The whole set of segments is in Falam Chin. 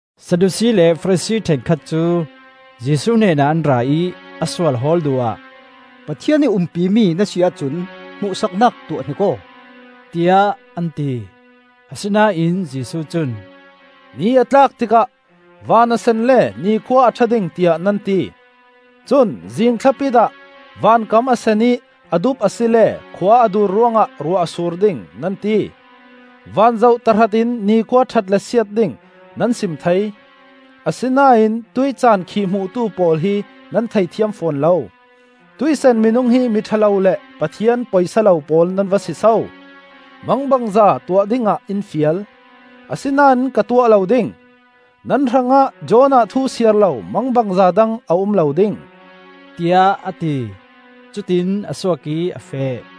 Sadusi le Farasi ṭhenkhat cu Jesuh hnenah an ra ih, a sual hawl duh ah, “Pathian ih umpi mi na si ahcun hmuhsaknak tuah hnik aw,” tiah an ti. Asinain Jesuh cun, “Ni a tlak tikah ‘Van a sen le nikhua a ṭha ding,’ tiah nan ti. Cun zing thlapit ah ‘Van kam a sen ih a dup asile khua a dur ruangah ruah a sur ding,’ nan ti. Van zoh tahratin ni khua ṭhat le siat ding nan sim thei, asinain tuih caan khihhmuhtu pawl hi nan theithiam fawn lo!, hi kut ngan cabu hrekkhat sungah cun a um lo. Tuih san minung hi mi ṭha lo le Pathian poisa lo pawl nan va si so! Mangbangza tuah dingah in fial, asinain ka tuah lo ding. Nan hrangah Jonah thu siar lo mangbangza dang a um lo ding,” tiah a ti. Cutiin a suak ih a feh.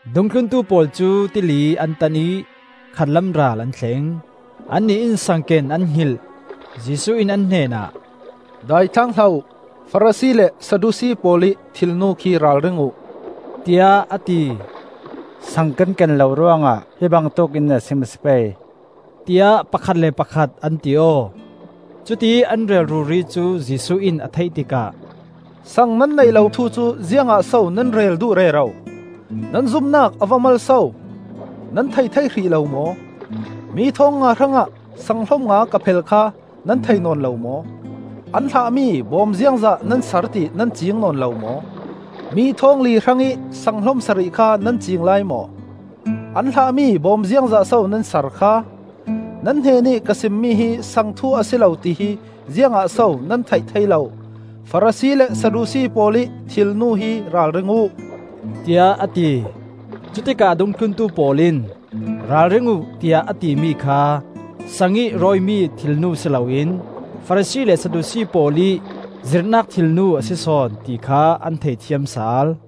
Dungthluntu pawl cu tili an tan ih khatlam ral an thleng; annih in saang ken an hngilh. Jesuh in an hnenah, “Daithlang hlah uh! Farasi le Sadusi pawl ih thilnu khi ralring uh,” tiah a ti. “Sang kan ken lo ruangah hi bangtuk in a sim a si pei,” tiah pakhat le pakhat an ti aw. Cutiih an rel ruri cu Jesuh in a theih tikah, “saang nan neih lo thu cu ziangah so nan rel duh rero? Nan zumnak a va mal so! Nan thei thei hrih lo maw? Mi thawng nga hrangah saang hlom nga ka phel kha nan thei nawn lo maw? An hlah mi bawm ziangzat nan sar ti nan cing nawn lo maw? Mi thawngli hrangih saang hlom sarih kha nan cing lai maw? An hlah mi bawm ziangzatso nan sar kha? Nan hnenih ka simmi hi saang thu a si lo tihi ziangah so nan theih thei lo? Farasi le Sadusi pawl ih thilnu hi ralring uh,” tiah a ti. Cutikah a dungthlun pawl in, “Ralring uh,” tiah a timi kha saangih rawimi thilnu si loin Farasi le Sadusi pawl ih zirhnak thilnu a si sawn, ti kha an thei thiam sal.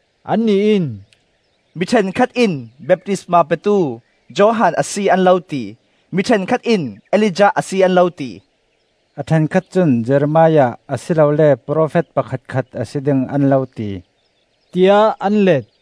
Annih in, “Mi ṭhenkhat in baptisma petu Johan a si an lo ti, mi ṭhenkhat in Elijah a si an lo ti. A ṭhenkhat cun Jeremiah, a si lole profet pakhatkhat a si ding an lo ti,” tiah an let.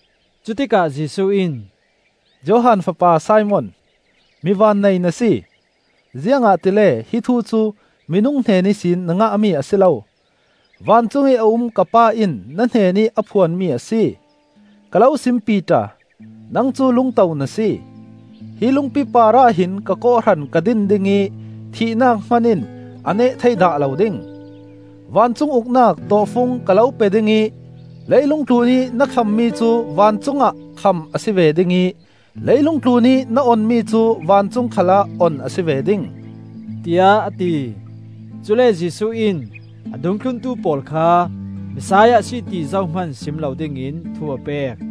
Cutikah Jesuh in, “Johan fapa Simon, mi vannei na si! Ziangahtile hi thu cu minung hnen ihsin na ngahmi a si lo, vancung i a um ka Pa in na hnenih a phuanmi a si. Ka lo sim Piter, nang cu lungto na si; hi lungpi parah hin ka kawhhran ka din ding ih thihnak hman in a neh thei dah lo ding. Vancung Uknak tawhfung ka lo pe ding ih leilung tlunih na khammi cu vancungah kham a si ve ding ih leilung tlunih na onmi cu vancung khalah on a si ve ding,” tiah a ti. Cule Jesuh in a dungthlun pawl kha Messiah a si ti zohman sim lo dingin thu a pek.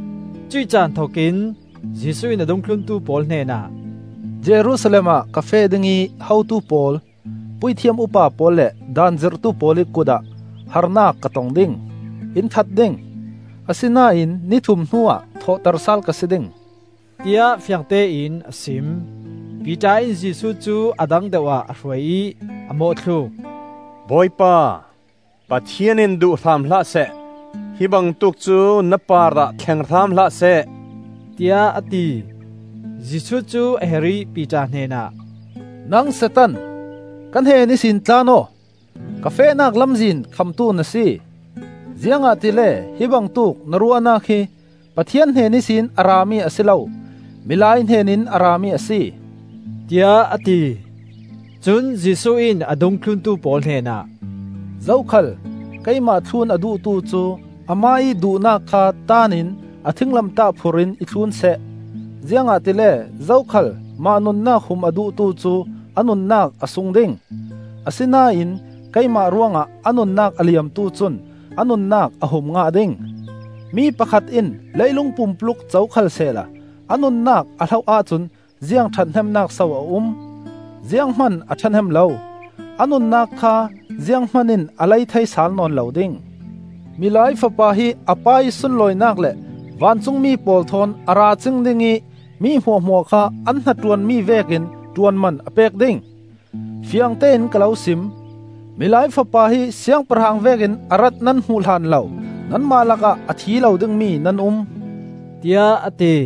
Cuih caan thokin Jesuh in a dungthluntu pawl hnenah, “Jerusalem ah ka feh ding ih hotu pawl, puithiam upa pawl le Daan zirhtu pawl ih kut ah harnak ka tong ding. In that ding, asinain ni thum hnuah thawhter sal ka si ding,” tiah fiangtein a sim. Piter in Jesuh cu a dang deuhah a hruai ih a mawhthluk. “Bawipa, Pathian in duh hram hlah seh. Hi bangtuk cu na parah thleng hram hlahseh,” tiah a ti. Jesuh cu a her ih Piter hnenah, “Nang Satan, ka hnen ihsin tlan aw! Ka fehnak lamzin khamtu na si, ziangahtile hi bangtuk na ruahnak hi Pathian hnen ihsin a rami a si lo, milai hnenin a rami a si,” tiah a ti. Cun Jesuh in a dungthluntu pawl hnenah, “Zokhal keimah thlun a duhtu cu amah ih duhnak kha taan in a thinglamtah phur in i thlun seh. Ziangahtile zokhal mah nunnak hum a duhtu cu a nunnak a sung ding; asinain keimah ruangah a nunnak a liamtu cun a nunnak a hum ngah ding. Mi pakhat in leilung pumpuluk co khalsehla a nunnak a hloh ahcun ziang ṭhathnemnak so a um? Zianghman a ṭhahnem lo! A nunnak kha zianghman in a lei thei sal nawn lo ding. Milai Fapa hi a Pa ih sunlawinak le vancungmi pawl thawn a ra cing ding ih mi hmuahhmuah kha an hnaṭuanmi vekin ṭuanman a pek ding. Fiangtein ka lo sim: Milai Fapa hi Siangpahrang vekin a rat nan hmuh hlan lo nanmah lakah a thi lo dingmi nan um,” tiah a ti.